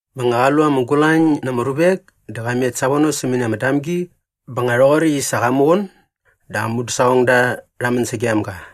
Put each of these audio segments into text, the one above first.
Bä nga qa lu ama gulañ na ama ruvek dä qa met savono sämäni ama damgi bä nga rhoqoräkt i sa qa muqun dä aa mudäsaqongda rha män sagem ga.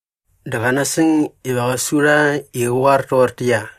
Dä qa nasäng iva qä su rha i qä qoar toqortäqyia,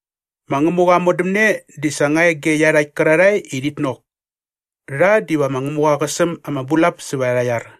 “Ma Ngämuqa aa modämne di sa nga e ge iarhakt kärarhae i rhit nok. Rha diva ma Ngämuqa qä säm ama bulap sävät arha iar.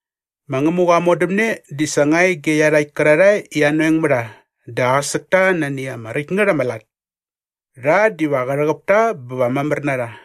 “Ma Ngämuqa aa modämne di sa nga e ge iarhakt kärarhae i anoeng mä rha dä aqäsäk ta nani ama räkt ngät ama lat. Rha diva qä rhäqäp ta bä va mamär na rha.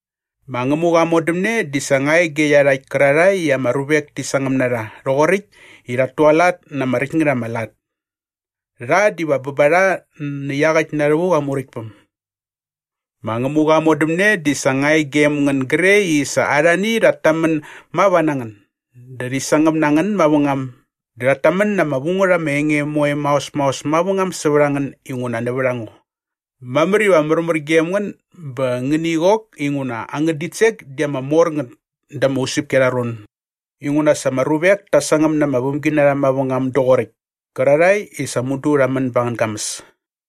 “Ma Ngämuqa aa modämne di sa nga e ge iarhakt kärarhae i ama ruvek ti sangäm na rha rhoqoräkt i rhat tualat na ama räkt ngät ama lat. Rha diva bä ba rha nä iaqäkt na rhävuk aa Muräktpäm. “Ma Ngämuqa aa modämne di sa nga e gem ngän gre i sa arhani rhat tamän mava na ngän dä rhi sangäm na ngän mavängam dä rhat tamän na ama vu ngät ama enge moe maos maos mavängam sävät a ngän inguna nävät a ngo. Mamär iva märmär gem ngän bä ngäni qok inguna angän ditsek di ama mor ngät da ama usäpki arha ron inguna sa ama ruvek ta sangäm na ama vämginarha mavängam doqoräkt kärarhae i sa mudu rha män ba angän gamäs.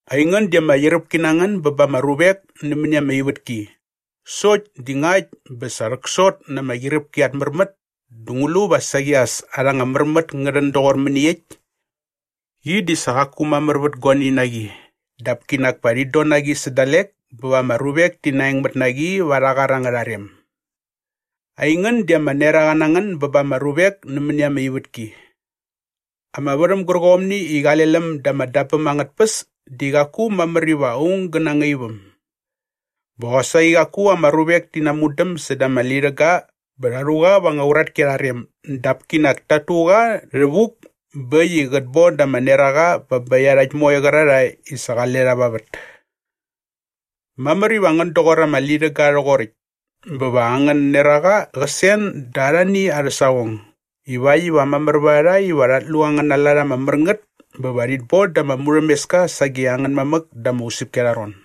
“Aingän di ama qyiräpki na ngän bä ba ama ruvek nämäni ama ivätki sokt di ngakt bä sa rhäksot na ama qyiräpki at märmät dä ngu lu va saqi as arha anga märmät ngä rhän doqor mäniekt? Qi di sa qaku mamär vät guani na qi dap kinak pa rhit don na qi dalek bä va ama ruvek ti naengmät na qi va arhä qar angärha rem. “Aingän di ama neraqa na ngän bä ba ama ruvek nämäni ama ivätki. Ama värhäm gärqomni i qale läm da ama dabäm angät tpäs di qaku mamär iva aung gä nangaip äm. Bä qosaqi qaku ama ruvek ti namudäm säda ama lirhäga bä rha rhu qa va anga uratki arha rem dap kinak tat tu qa rhävuk bä äkt i qät bon da ama neraqa bä bä iarhakt moe qärarhae i sa qale rha va vät. Mamär iva ngän doqor ama lirhäga rhoqoräkt bä va angän neraqa qä sen da arhani arhä saqong ivakt iva mamär vät a rha iva rhat lu angäna lat ama mär ngät bä va rhit bon da ama murhämeska sage angän mamäk da ama usäpki arha ron.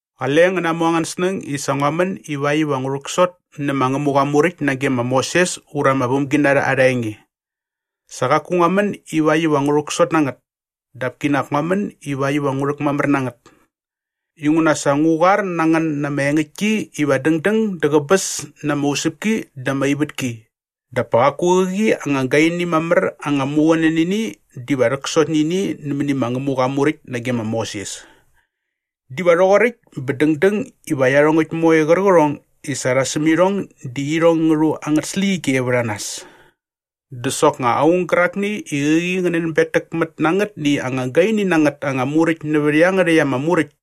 “Qale ngän namu angän snäng i sa ngua män ivakt iva ngu rhäksot nä ma Ngämuqa aa Muräkt nage ma Moses ura ama vämginarha arha enge. Sa qaku ngua män ivakt iva ngu rhäksot na ngät dap kinak ngua män ivakt iva ngu rhäkmamär na ngät. Inguna sa ngu qoar na ngän na ama engäktki iva dängdäng dä qäbäs na ama usäpki dä ama ivätki dap pa qaku qäqi anga gaini mamär anga muqunänini diva rhäksot nä ini nämäni ma Ngämuqa aa Muräkt nage ma Moses. Diva rhoqoräkt bä dängdäng iva iarhongäkt moe qärqärhong i sa rha säm irhong di irhong ngä rhu irhong angät släqyige vät a nas. Dä soknga aung gärakni i qäqi qä nänbetäkmät na angätni anga gaini na ngät anga muräkt nävät iangärhäkt ama muräkt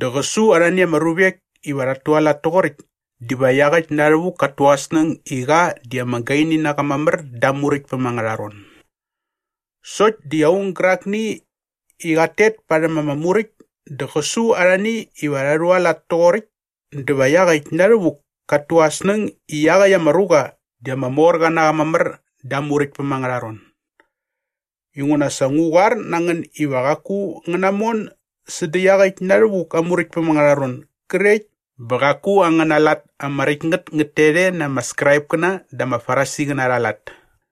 dä qä su arhani ama ruvek iva rhat tualat toqoräkt diva iaqäkt na rhävuk kat tu aa snäng i qa di ama gaini na qa mamär da aa Muräktpäm angärha ron. Sokt di aung gärakni i qat tet parhäm ama muräkt dä qä su arhani iva rha rhualat toqoräkt dä va iaqäkt na rhävuk kat tu aa snäng i iaqäkt ama ruqa di ama mor qa na qa mamär da aa Muräktpäm angärha ron. Inguna sa ngu qoar na ngän iva qaku ngän namon sädä iaqäkt na rhävuk aa Muräktpäm angärha ron grekt bä qaku angäna lat ama räkt ngät ngät tet e na ama Skraipkäna dä ama Farisiqäna arha lat.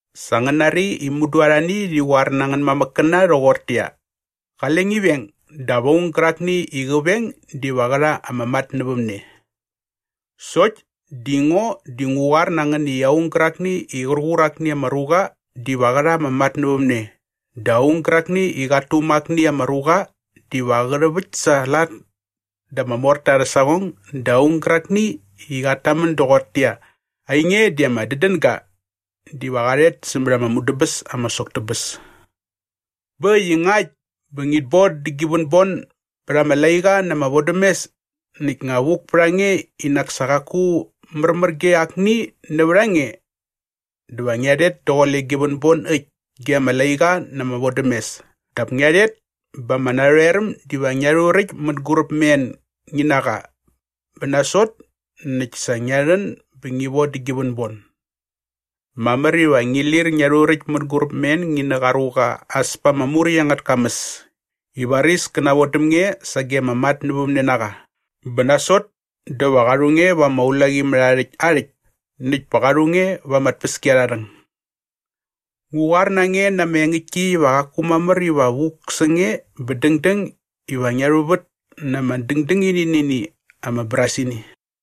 “Sa ngän nari i mudu arhani rhi qoar na angän mamäkkäna rhoqortäqyia, ‘Qale ngi veng dap aung gärakni i qä veng diva qä rha ama matnävämne.’ Sokt di ngo di ngu qoar na ngän i aung gärakni i qär qur akni ama ruqa diva qä rha ama matnävämne dä aung gärakni i qat tuma akni ama ruqa diva qä rhäväkt sa aa lat da ama morta arhä saqong dä aung gärakni i qat tamän doqortäqyia, ‘Ainge di ama dädänga!’ diva qa rhet sämät ama mudäbäs ama sok tä bäs. “Bä äkt i ngakt bä ngit boda gi vänbon bät ama laiqa na ama vodämes näkt nga vuk pät a nge i nak sa qaku märmär ge akni nävät a nge dä va ngia rhet daqule gi vänbon äkt ge ama laiqa na ama vodämes dap ngia rhet bä ama narhoeräm diva ngia rhuräkt mänguräp mä en ngi na qa bä nasot näkt sa ngia rhän bä ngi vodä gi vänbon. “Mamär iva ngi lir ngia rhuräkt mänguräp mä en ngi nä qa ruqa as pa ama muräkt angät kamäs i varis kä navon däm nge sage ama matnävämnenaqa bä nasot dä va qa rhu nge va ama ulaqimärhaarhäkt aa rhäkt näkt pa qa rhu nge va ama tpäskiarharhäng. Ngu qoar na nge na ama engäktki iva qaku mamär iva vuk sä nge bä dängdäng iva ngia rhuvät na ama dändängini nä ini ama brasini.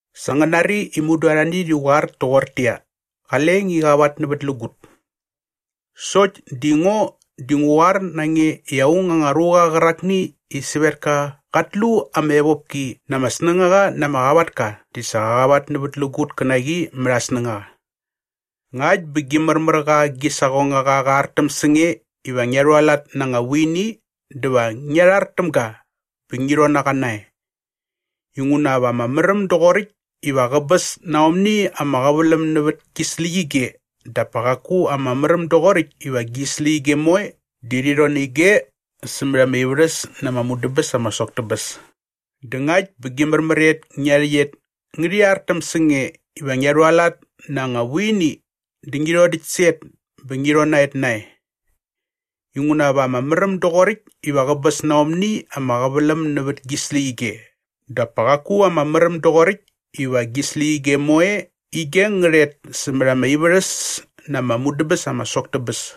“Sa ngän nari i mudu arhani rhi qoar toqortäqyia, ‘Qale ngi qavatnävätlägut.’ Sokt di ngo di ngu qoar na nge i aung anga ruqa qärakni i sävetka qat lu ama evopki na ama snängaqa na ama qavatka di sa qa qavatnävätlägut kä na qi mät aa snängaqa. Ngakt bä gi märmär qa gi saqongaqa qä rhartäm sä nge iva ngia rhualat na anga vuini dä va ngia rhar täm ga bä ngi rhon na qa nae. Inguna va ama märäm doqoräkt iva qäbäs na aomni ama qäväläm nävät gi släqyige dap pa qaku ama märäm doqoräkt iva gi släqyige moe di rhi rhon nä ige sämät ama ivärhäs na ama mudäbäs ama sok tä bäs. Dä ngakt bä gi märmär et ngia rhäqyet ngärhi rhartäm sä nge iva ngia rhualat na anga vuini dä ngi rhodäkt sä et bä ngi rhon na et nae. Inguna va ama märäm doqoräkt iva qäbäs na aomni ama qäväläm nävät gi släqyige dap pa qaku ama märäm doqoräkt iva gi släqyige moe ige ngä rhet sämät ama ivärhäs na ama mudäbäs ama sok tä bäs.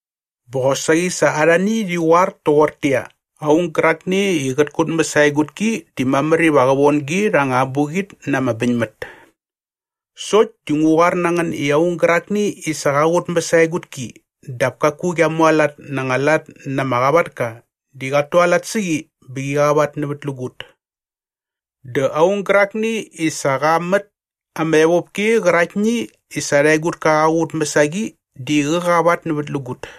“Bä qosaqi sa arhani rhi qoar toqortäqyia, ‘Aung gärakni i qät kutmäs aa egutki di mamär iva qa von gi rha anga abuqit na ama bäñmät.’ Sokt di ngu qoar na ngän i aung gärakni i sa qa qutmäs aa egutki dap kaku qia mualat na anga lat na ama qavatka di qat tualat sä qi bä qi qavatnävätlägut. Dä aung gärakni i sa qa mät ama evopki qäraktni i sa arha egutka qa qutmäs a qi di qä qavatnävätlägut.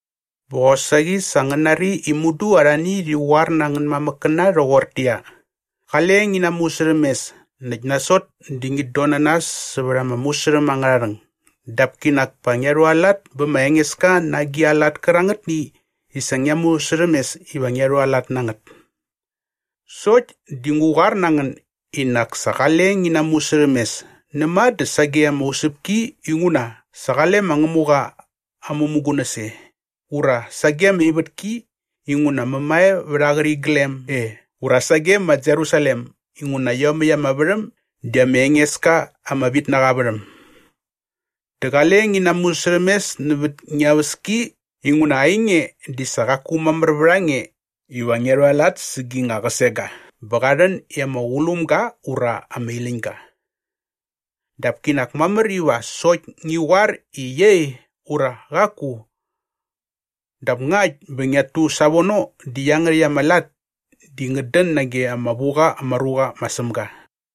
“Bä qosaqi sa ngän nari i sa mudu arhani rhi qoar na angän mamäkkäna rhoqortäqyia, ‘Qale ngi namusärhämes näkt nasot dä ngit don na nas sävät ama musärhäm angärha rhäng dap kinak pa ngia rhualat bä bä ma Engeska na agi a lat kärangätni i sa ngia musärhämes iva ngia rhualat na ngät.’ Sokt di ngu qoar na ngän i nak sa qale ngi namusärhämes näma dä sage ama usäpki inguna sa qale ma Ngämuqa aa mämugunäs e ura sage ama ivätki inguna mämae vät aa qäriglem e ura sage ma Jerusalem inguna iomäkt ama värhäm di ama enges ka ama vitnaqa aa värhäm. Dä qale ngi namusärhämes nävät ngia väski inguna ainge di sa qaku mamär vät a nge iva ngia rhualat sä gi nga qäsega bä qa rhän i ama qulum ga ura ama iläñ ga. Dap kinak mamär iva sokt ngi qoar i ‘Iei’ ura ‘Qaku.’ Dap ngakt bä ngiat tu savono di iangärhäkt ama lat di ngät dän nage ama vu qa ama ruqa ma Sämga.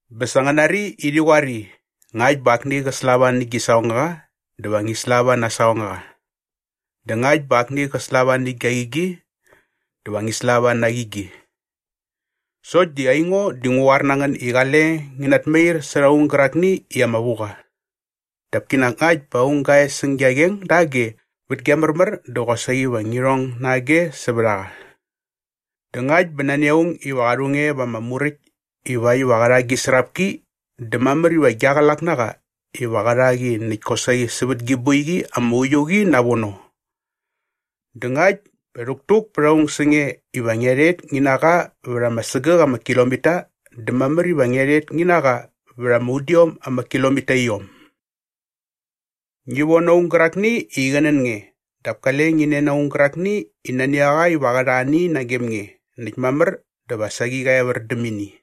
“Bä sa ngän nari i rhi qoar i, ‘Ngakt bä akni qä slava nä gi saqongaqa dä va ngi slava na aa saqongaqa. Dä ngakt bä akni qä slava nä gia qigi dä va ngi slava na aa qigi.’ Sokt di aingo di ngu qoar na ngän i qale ngi natmair särha aung gärakni i ama vu qa. Dap kinak ngakt bä aung gä e säng gia qeng dage vät gi märmär dä qosaqi va ngi rhong na age sävät a qa. Dä ngakt bä nani aung iva qa rhu nge va ama muräkt ivakt iva qä rha gi srapki dä mamär iva gia qlak na qa iva qä rha qi näkt kosaqi sävät gi boiqi ama uiu qi navono. Dä ngakt bä rhäktuk pät aung sä nge iva ngia rhet ngi na qa vät ama sägäk ama kilomita dä mamär iva ngia rhet ngi na qa vät ama udiom ama kilomitaiom. Ngi von aung gärakni i qä nän nge dap kale ngi nen aung gärakni i nani a qa iva qä rha ani nagem nge näkt mamär dä va saqi qä evär däm ini.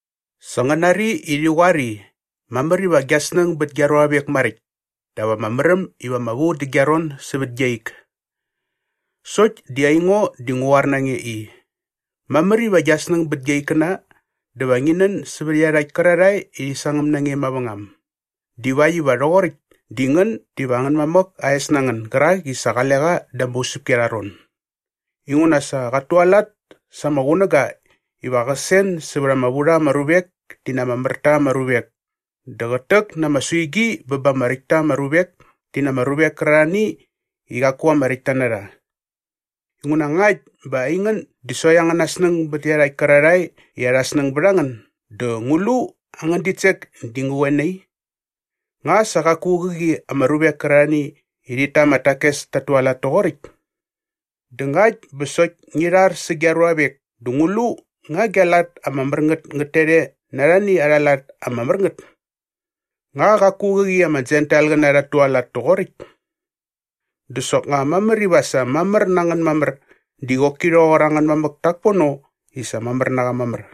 “Sa ngän nari i rhi qoar i, ‘Mamär iva gia snäng bät gia ruavek maräkt dap ama märäm iva ama vu dä gia ron sävät gia ik.’ Sokt di ngo di ngu qoar na nge i, mamär iva gia snäng bät gia ikkäna dä va ngi nän sävät iarhakt kärarhae i rhi sangäm na nge mavängam divakt iva rhoqoräkt di ngän diva angän mamäk aa es na ngän gärak i sa qale qa da ama usäpki arha ron. Inguna sa qat tualat sa aa qunäga iva qä sen sävät ama vu rha ama ruvek ti na ama mär ta ama ruvek dä qät täk na ama suigi bä ba ama räkt ta ama ruvek ti na ama ruvek kärarhani i qaku ama räkt ta na rha. Inguna ngakt bä aingän di sokt angäna snäng bät iarhakt kärarhae i arha snäng bät a ngän dä ngu lu angän ditsek di ngä qoe nai? Nga sa qaku qäqi ama ruvek kärarhani i rhit ta ama takes tat tualat toqoräkt? Dä ngakt bä sokt ngi rhar sä gia ruavek dä ngu lu nga gia lat ama mär ngät ngät tet e na arhani arha lat ama mär ngät? Nga qaku qäqi ama Jentailqäna rhat tualat toqoräkt? Dä soknga mamär iva sa mamär na ngän mamär di qoki rhoqor angän mam dak pono i sa mamär na qa mamär.